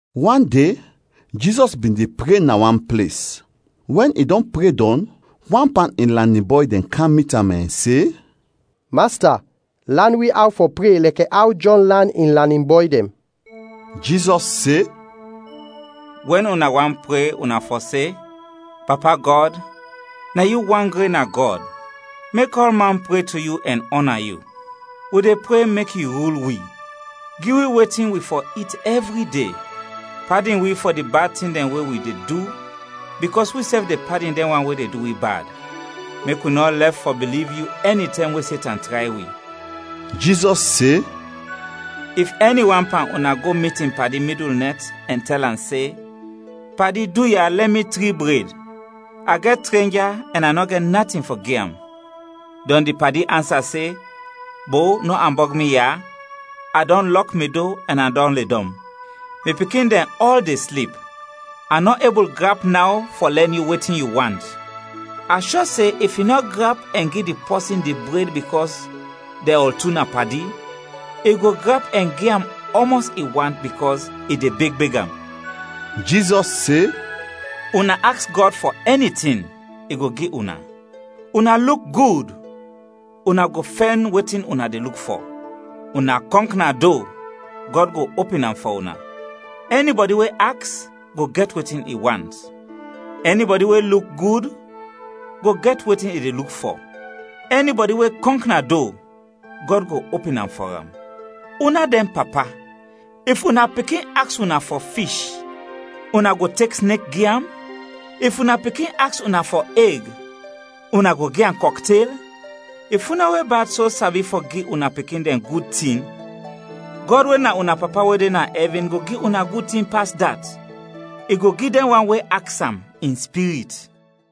Wan de Jizɔs bin de pre na wan ples; wɛn i dɔn pre dɔn, wan pan in lanin bɔy dɛn kam mit am ɛn se, “Masta, lan wi aw fɔ pre lɛkɛ aw Jɔn lan in lanin bɔy dɛn.” Jizɔs se, “Wɛn una want pre, una fɔ se: ‘Papa Gɔd, na yu wan gren na Gɔd, mek ɔlman pre to yu ɛn ɔna yu. Wi de pre mek yu rul wi. Gi wi wetin wi fɔ it ɛvri de. Padin wi fɔ di bad tin dɛn wi de du, bikɔs wisɛf de padin dɛn wan we de du wi bad. Mek wi nɔ lɛf fɔ biliv yu ɛnitɛm we Setan tray wi.’” Jizɔs se, “If ɛni wan pan una go mit in padi midul nɛt ɛn tɛl am se, ‘Padi, duya, lɛn mi tri bred. A gɛt trenja ɛn a nɔ gɛt natin fɔ gi am.’ Dɔn di padi ansa se, ‘Bo, nɔ ambɔg mi ya, a dɔn lɔk mi do ɛn a dɔn ledɔm. Mi pikin dɛn ɔl de slip. A nɔ ebul grap naw fɔ lɛn yu wetin yu want.’ A shɔ se if i nɔ grap ɛn gi di pɔsin di bred bikɔs dɛn ɔl tu na padi, i go grap ɛn gi am ɔmɔs i want bikɔs i de beg beg am.” Jizɔs se, “Una aks Gɔd fɔ ɛni tin, i go gi una. Una luk gud, una go fɛn wetin una de luk fɔ. Una kɔnk na do, Gɔd go opin am fɔ una. Ɛnibɔdi we aks, go gɛt wetin i want. Ɛnibɔdi we luk gud, go gɛt wetin i de luk fɔ. Ɛnibɔdi we kɔnk na do, Gɔd go opin am fɔ am. Una dɛn papa, if una pikin aks una fɔ fish, una go tek snek gi am? If una pikin aks una fɔ eg, una go gi am kɔktel? If una we bad so sabi fɔ gi una pikin dɛn gud tin, Gɔd we na una Papa we de na ɛvin go gi una gud tin pas dat; i go gi dɛn wan we aks am in Spirit!”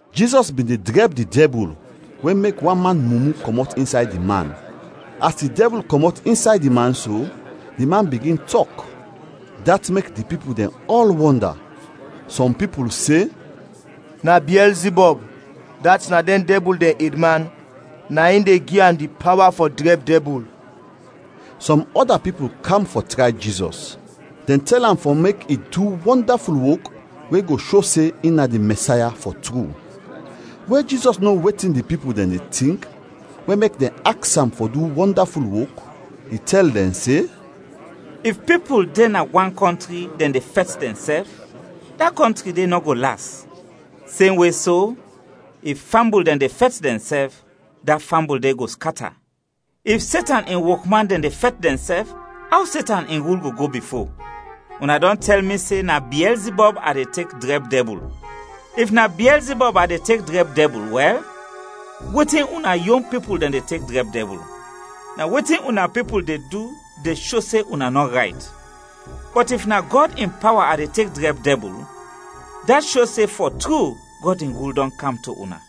Jizɔs bin de drɛb di dɛbul we mek wan man mumu kɔmɔt insay di man. As di dɛbul kɔmɔt insay di man so, di man bigin tɔk; dat mek di pipul dɛn ɔl wɔnda. Sɔm pipul se, “Na Biɛlzibɔb, dat na dɛn dɛbul dɛn edman, na in de gi am di pawa fɔ drɛb dɛbul.” Sɔm ɔda pipul kam fɔ tray Jizɔs; dɛn tɛl am fɔ mek i du wɔndaful wok we go sho se in na di Mɛsaya, fɔ tru. We Jizɔs no wetin di pipul dɛn de tink we mek dɛn aks am fɔ du wɔndaful wok, i tɛl dɛn se, “If pipul de na wan kɔntri, dɛn de fɛt dɛnsɛf, da kɔntri de nɔ go las. Semwe so, if fambul dɛn de fɛt dɛnsɛf, da fambul de go skata. If Setan in wokman dɛn de fɛt dɛnsɛf, aw Setan in rul go go bifo? Una dɔn tɛl mi se na Biɛlzibɔb a de tek drɛb dɛbul. If na Biɛlzibɔb a de tek drɛb dɛbul, wɛl, wetin una yon pipul dɛn de tek drɛb dɛbul? Na wetin una pipul de du de sho se una nɔ rayt. Bɔt if na Gɔd in pawa a de tek drɛb dɛbul, dat sho se fɔ tru Gɔd in rul dɔn kam to una.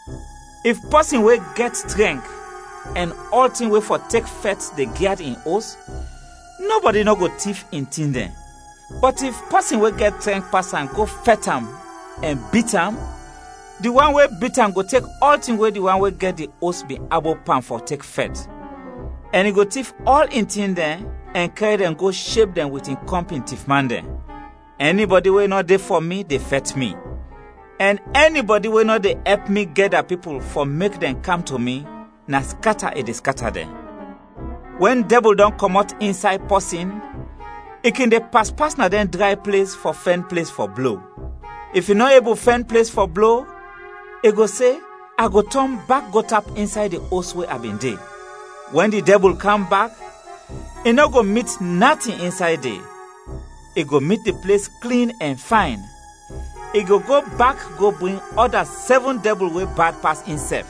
“If pɔsin we gɛt trɛnk ɛn ɔltin we fɔ tek fɛt de gyad in os, nɔbɔdi nɔ go tif in tin dɛn. Bɔt if pɔsin we gɛt trɛnk pas am go fɛt am ɛn bit am, di wan we bit am go tek ɔltin we di wan we gɛt di os bin abop pan fɔ tek fɛt, ɛn i go tif ɔl in tin dɛn ɛn kɛr dɛn go sheb dɛn wit in kɔmpin tifman dɛn. “Ɛnibɔdi we nɔ de fɔ mi de fɛt mi, ɛn ɛnibɔdi we nɔ de ɛp mi gɛda pipul fɔ mek dɛn kam to mi, na skata i de skata dɛn. “Wɛn dɛbul dɔn kɔmɔt insay pɔsin, i kin de pas pas na dɛn dray ples fɔ fɛn ples fɔ blo. If i nɔ ebul fɛn ples fɔ blo, i go se, ‘A go tɔn bak go tap insay di os we a bin de.’ Wɛn di dɛbul kam bak, i nɔ go mit natin insay de, i go mit di ples klin ɛn fayn. I go go bak go bring ɔda sɛvin dɛbul we bad pas insɛf.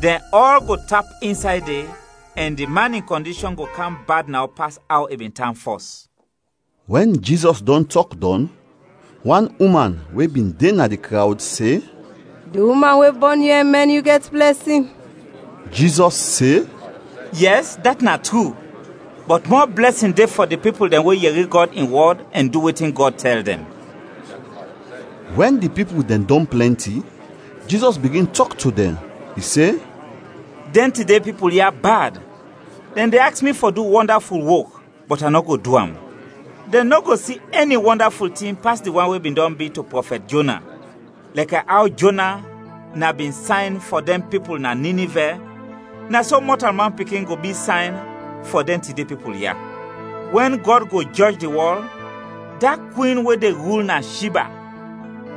Dɛn ɔl go tap insay de ɛn di man in kɔndishɔn go kam bad naw pas aw i bin tan fɔs.” Wɛn Jizɔs dɔn tɔk dɔn, wan uman we bin de na di krawd se, “Di uman we bɔn yu ɛn mɛn yu gɛt blɛsin!” Jizɔs se, “Yɛs, dat na tru, bɔt mɔ blɛsin de fɔ di pipul dɛn we yɛri Gɔd in wɔd ɛn du wetin Gɔd tɛl dɛn.” Wɛn di pipul dɛn dɔn plɛnti, Jizɔs bigin tɔk to dɛn. I se, “Dɛn tide pipul ya bad! Dɛn de aks mi fɔ du wɔndaful wok, bɔt a nɔ go du am. Dɛn nɔ go si ɛni wɔndaful tin pas di wan we bin dɔn bi to prɔfɛt Jona. Lɛkɛ aw Jona na bin sayn fɔ dɛn pipul na Ninivɛ, na so Mɔtalman Pikin go bi sayn fɔ dɛn tide pipul ya. Wɛn Gɔd go jɔj di wɔl, da kwin we de rul na Shiba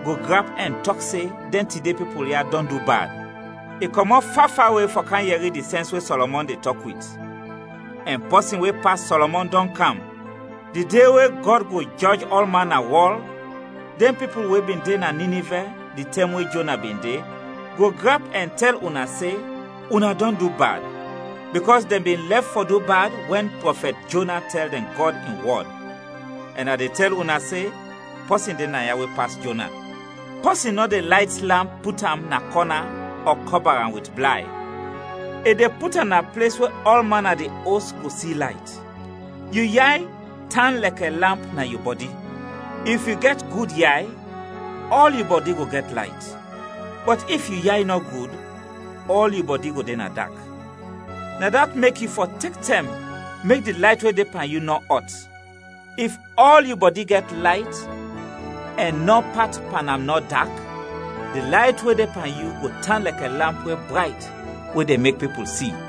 go grap ɛn tɔk se dɛn tide pipul ya dɔn du bad; i kɔmɔt fa fawe fɔ kam yɛri di sɛns we Sɔlɔmɔn de tɔk wit; ɛn pɔsin we pas Sɔlɔmɔn dɔn kam. Di de we Gɔd go jɔj ɔlman na wɔl, dɛn pipul we bin de na Ninivɛ di tɛm we Jona bin de, go grap ɛn tɛl una se, una dɔn du bad; bikɔs dɛn bin lɛf fɔ du bad wɛn prɔfɛt Jona tɛl dɛn Gɔd in wɔd; ɛn a de tɛl una se, pɔsin de naya we pas Jona. “Pɔsin nɔ de layt lamp put am na kɔna ɔ kɔba am wit blay, i de put am na ples we ɔlman na di os go si layt. Yu yay tan lɛkɛ lamp na yu bɔdi. If yu gɛt gud yay, ɔl yu bɔdi go gɛt layt, bɔt if yu yay nɔ gud, ɔl yu bɔdi go de na dak. Na dat mek yu fɔ tek tɛm mek di layt we de pan yu nɔ ɔt. If ɔl yu bɔdi gɛt layt ɛn nɔ pat pan am nɔ dak, di layt we de pan yu go tan lɛkɛ lamp we brayt we de mek pipul si.”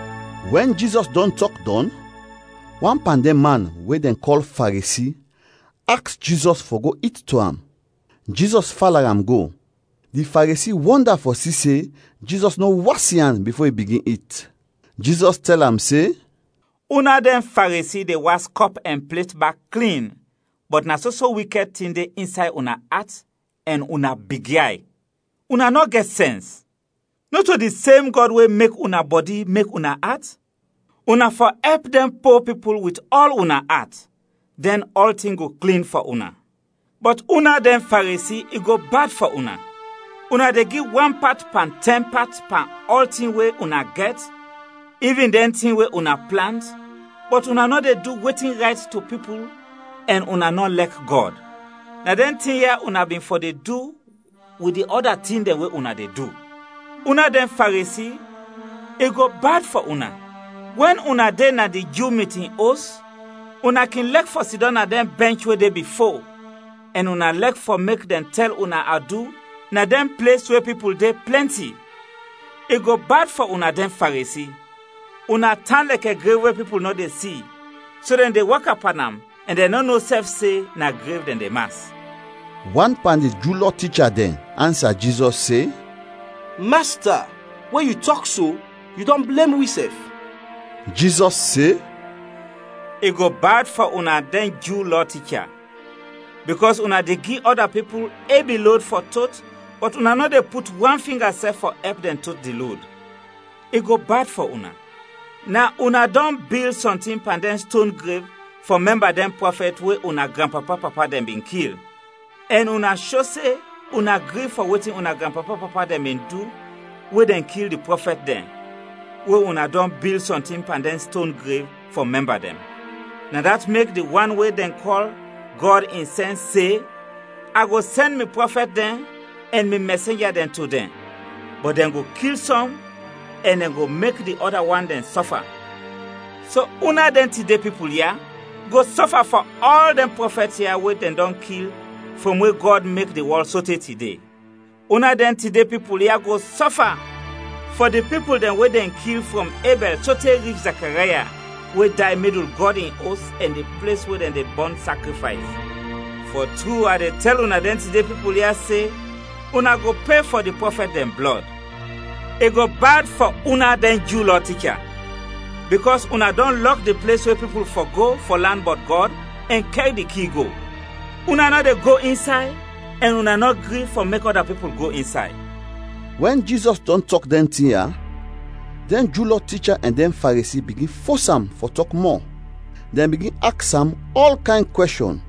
Wɛn Jizɔs dɔn tɔk dɔn, wan pan dɛn man we dɛn kɔl Faresi aks Jizɔs fɔ go it to am; Jizɔs fala am go. Di Faresi wɔnda fɔ si se Jizɔs nɔ was in an bifo i bigin it. Jizɔs tɛl am se, “Una dɛn Faresi de was kɔp ɛn plet bak klin, bɔt na soso wikɛd tin de insay una at ɛn una bigyay. Una nɔ gɛt sɛns! Nɔto di sem Gɔd we mek una bɔdi mek una at? Una fɔ ɛp dɛn po pipul wit ɔl una at, dɛn ɔltin go klin fɔ una. “Bɔt una dɛn Faresi, i go bad fɔ una! Una de gi wan pat pan tɛn pat pan ɔltin we una gɛt, ivin dɛn tin we una plant, bɔt una nɔ de du wetin rayt to pipul ɛn una nɔ lɛk Gɔd. Na dɛn tin ya una bin fɔ de du wit di ɔda tin dɛn we una de du. “Una dɛn Faresi, i go bad fɔ una! Wɛn una de na di Ju mitin os, una kin lɛk fɔ sidɔm na dɛn bɛnch we de bifo, ɛn una lɛk fɔ mek dɛn tɛl una adu na dɛn ples we pipul de plɛnti. I go bad fɔ una dɛn Faresi! Una tan lɛkɛ grev we pipul nɔ de si so dɛn de waka pan am ɛn dɛn nɔ no sɛf se na grev dɛn de mas.” Wan pan di Ju Lɔ ticha dɛn ansa Jizɔs se, “Masta, we yu tɔk so, yu dɔn blem wisɛf!” Jizɔs se, “I go bad fɔ una dɛn Ju Lɔ ticha, bikɔs una de gi ɔda pipul ebi lod fɔ tot bɔt una nɔ de put wan finga sɛf fɔ ɛp dɛn tot di lod. I go bad fɔ una! Na una dɔn bil sɔntin pan dɛn ston grev fɔ mɛmba dɛn prɔfɛt we una granpapa-papa dɛn bin kil. Ɛn una sho se una gri fɔ wetin una granpapa-papa dɛn bin du we dɛn kil di prɔfɛt dɛn, we una dɔn bil sɔntin pan dɛn ston grev fɔ mɛmba dɛn. Na dat mek di wan we dɛn kɔl ‘Gɔd in Sɛns’ se, ‘A go sɛn mi prɔfɛt dɛn ɛn mi mɛsenja dɛn to dɛn, bɔt dɛn go kil sɔm ɛn dɛn go mek di ɔda wan dɛn sɔfa.’ So una dɛn tide pipul ya go sɔfa fɔ ɔl dɛn prɔfɛt ya we dɛn dɔn kil frɔm we Gɔd mek di wɔl sote tide. Una dɛn tide pipul ya go sɔfa fɔ di pipul dɛn we dɛn kil frɔm Ebɛl sote rich Zakaraya we day midul Gɔd in Os ɛn di ples we dɛn de bɔn sakrifays. Fɔ tru, a de tɛl una dɛn tide pipul ya, se una go pe fɔ di prɔfɛt dɛn blɔd! “I go bad fɔ una dɛn Ju Lɔ ticha, bikɔs una dɔn lɔk di ples we pipul fɔ go fɔ lan bɔt Gɔd ɛn kɛr di ki go. Una nɔ de go insay ɛn una nɔ gri fɔ mek ɔda pipul go insay.” Wɛn Jizɔs dɔn tɔk dɛn tin ya, dɛn Ju Lɔ ticha ɛn dɛn Faresi bigin fos am fɔ tɔk mɔ, dɛn bigin aks am ɔl kayn kwɛshɔn;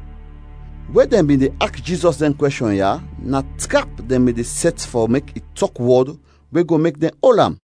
we dɛn bin de aks Jizɔs dɛn kwɛshɔn ya na trap dɛn bin de sɛt fɔ mek i tɔk wɔd we go mek dɛn ol am.